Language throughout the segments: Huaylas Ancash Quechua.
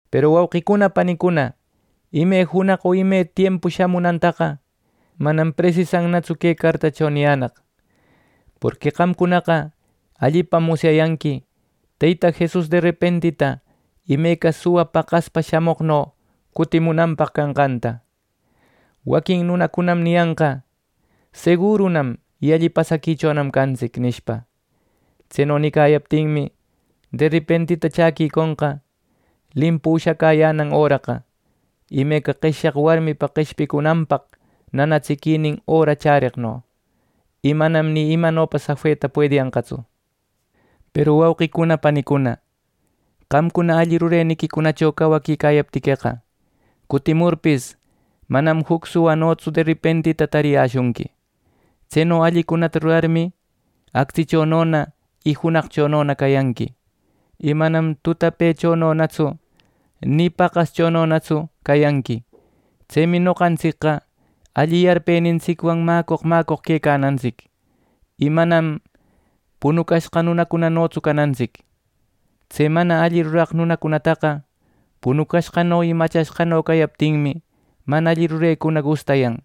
Peru wauqicuna panicuna, ime junaq o ime tiempu shamunantaqa, manam presisantsu que cartacho niyänaq; porqui qamcunaqa allipam musyayanqui Teyta Jesus derepentita imeca suwa paqaspa shamoqno cutimunanpaq canqanta. Waquin nunacunam niyanqa: “Segurunam y alli pasaquichonam cantsic” nishpa. Tseno nicayaptinmi, derepentita chaquiconqa limpu ushacäyänan öraqa, imeca qeshyaq warmipa qeshpicunanpaq nanatsiquinin öra chäreqno, y manam ni imano safeta puediyanqatsu. Peru wauqicuna panicuna, qamcuna alli rureniquicunacho cawaquicayaptiqueqa, cutimurpis, manam juc suwanotsu derepentita tariyäshunqui. Tseno allicunata rurarmi, actsichonona y junaqchonona cayanqui, y manam tutapechononatsu ni paqaschononatsu cayanqui. Tsemi noqantsicqa alli yarpenintsicwan mäcoq mäcoq quecanantsic, y manam punucashqa nunacunanotsu canantsic. Tse mana alli ruraq nunacunataqa punucashqano y machashqano cayaptinmi, mana alli rurecuna gustayan.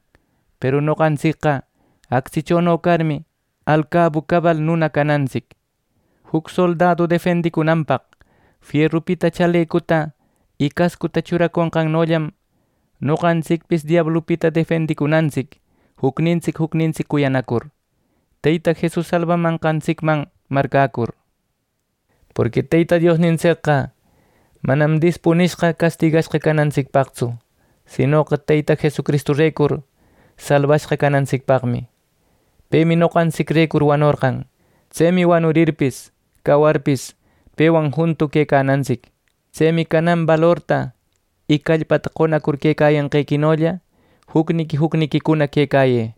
Peru noqantsicqa actsichono carmi, alcabu cabal nuna canantsic. Juc soldadu defendicunanpaq fierupita chalecuta y cascuta churaconqannollam, noqantsicpis diablupita defendicunantsic, jucnintsic jucnintsic cuyanacur, Teyta Jesus salbamanqantsicman marcäcur, porqui Teyta Diosnintsicqa manam dispunishqa castigashqa canantsicpaqtsu, sinoqa Teyta Jesucristurecur, salbashqa canantsicpaqmi. Pemi noqantsicrecur wanorqan. Tsemi wanurirpis cawarpis, pewan juntu quecanantsic. Tsemi canan balorta y callpata qonacur quecayanqequinolla jucniqui jucniquicuna quecayë.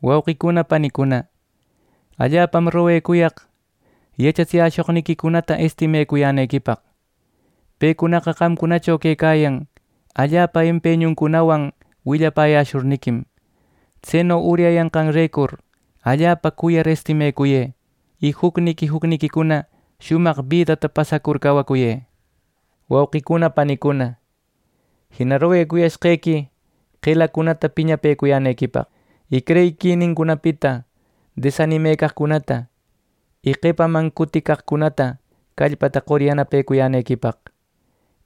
Wauqicuna panicuna, allapam roguecuyaq yachatsiyäshoqniquicunata estimecuyänequipaq. Pecunaqa qamcunacho quecayan allapa empeñuncunawan willapäyäshurniquim. Tseno uryayanqanrecur, allapa cuyar estimecuyë, y jucniqui jucniquicuna shumaq bidata pasacur cawacuyë. Wauqicuna panicuna, jina roguecuyashqequi qelacunata piñapëcuyänequipaq, y creyiquinincunapita desanimecaqcunata, y qepaman cuticaqcunata callpata qor yanapecuyänequipaq,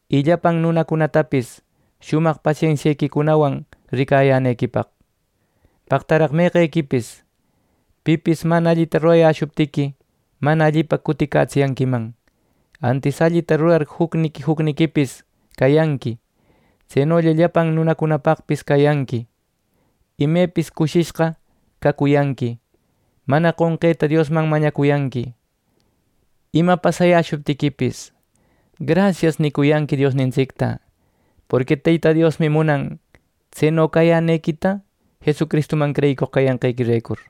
y llapan nunacunatapis shumaq pasensiequicunawan ricayänequipaq. Paqtaraq meqequipis, pipis mana allita rurayäshuptiqui, mana allipa cutitsiyanquiman, antis allita rurar jucniqui jucniquipis cayanqui. Tsenolla llapan nunacunapaqpis cayanqui. Imepis cushishqa cacuyanqui. Mana qonqeta Diosman mañacuyanqui. Ima pasayäshuptiquipis, “Grasias” nicuyanqui Diosnintsicta, porqui Teyta Diosmi munan tseno cayänequita Jesucristuman creyicoq cayanqequirecur.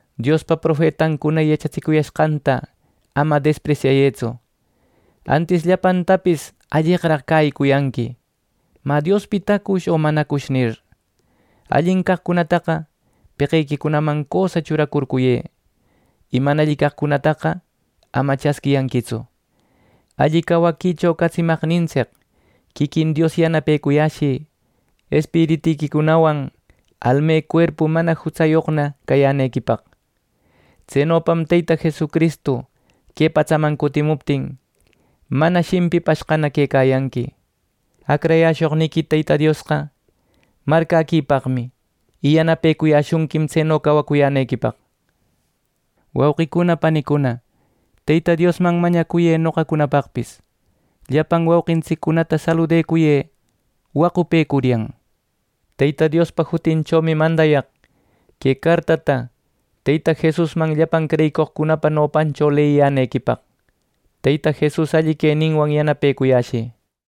Diospa profetancuna yachatsicuyashqanta ama despresyayëtsu. Antis llapantapis alleqraq cäyicuyanqui “Mä ¿Diospitacush o manacush?” nir. Allin caqcunataqa peqequicunaman cösa churacurcuyë. Y mana alli caqcunataqa ama chasquiyanquitsu. Alli cawaquicho catsimaqnintsic quiquin Dios yanapecuyäshï espiritiquicunawan almecuerpu mana jutsayoqna cayänequipaq. Tsenopam Teyta Jesucristu que patsaman cutimuptin, mana shimpipashqana quecayanqui. Acrayäshoqniqui Teyta Diosqa marcäquipaqmi, y yanapecuyashunquim tseno cawacuyänequipaq. Wauqicuna panicuna, Teyta Diosman mañacuyë noqacunapaqpis. Llapan wauqintsiccunata saludacuyë wacupecuryan. Teyta Diospa jutinchomi mandayaq que cartata Teyta Jesusman llapan creyicoqcunapa nopancho leyiyänequipaq. Teyta Jesus alli queninwan yanapecuyashï.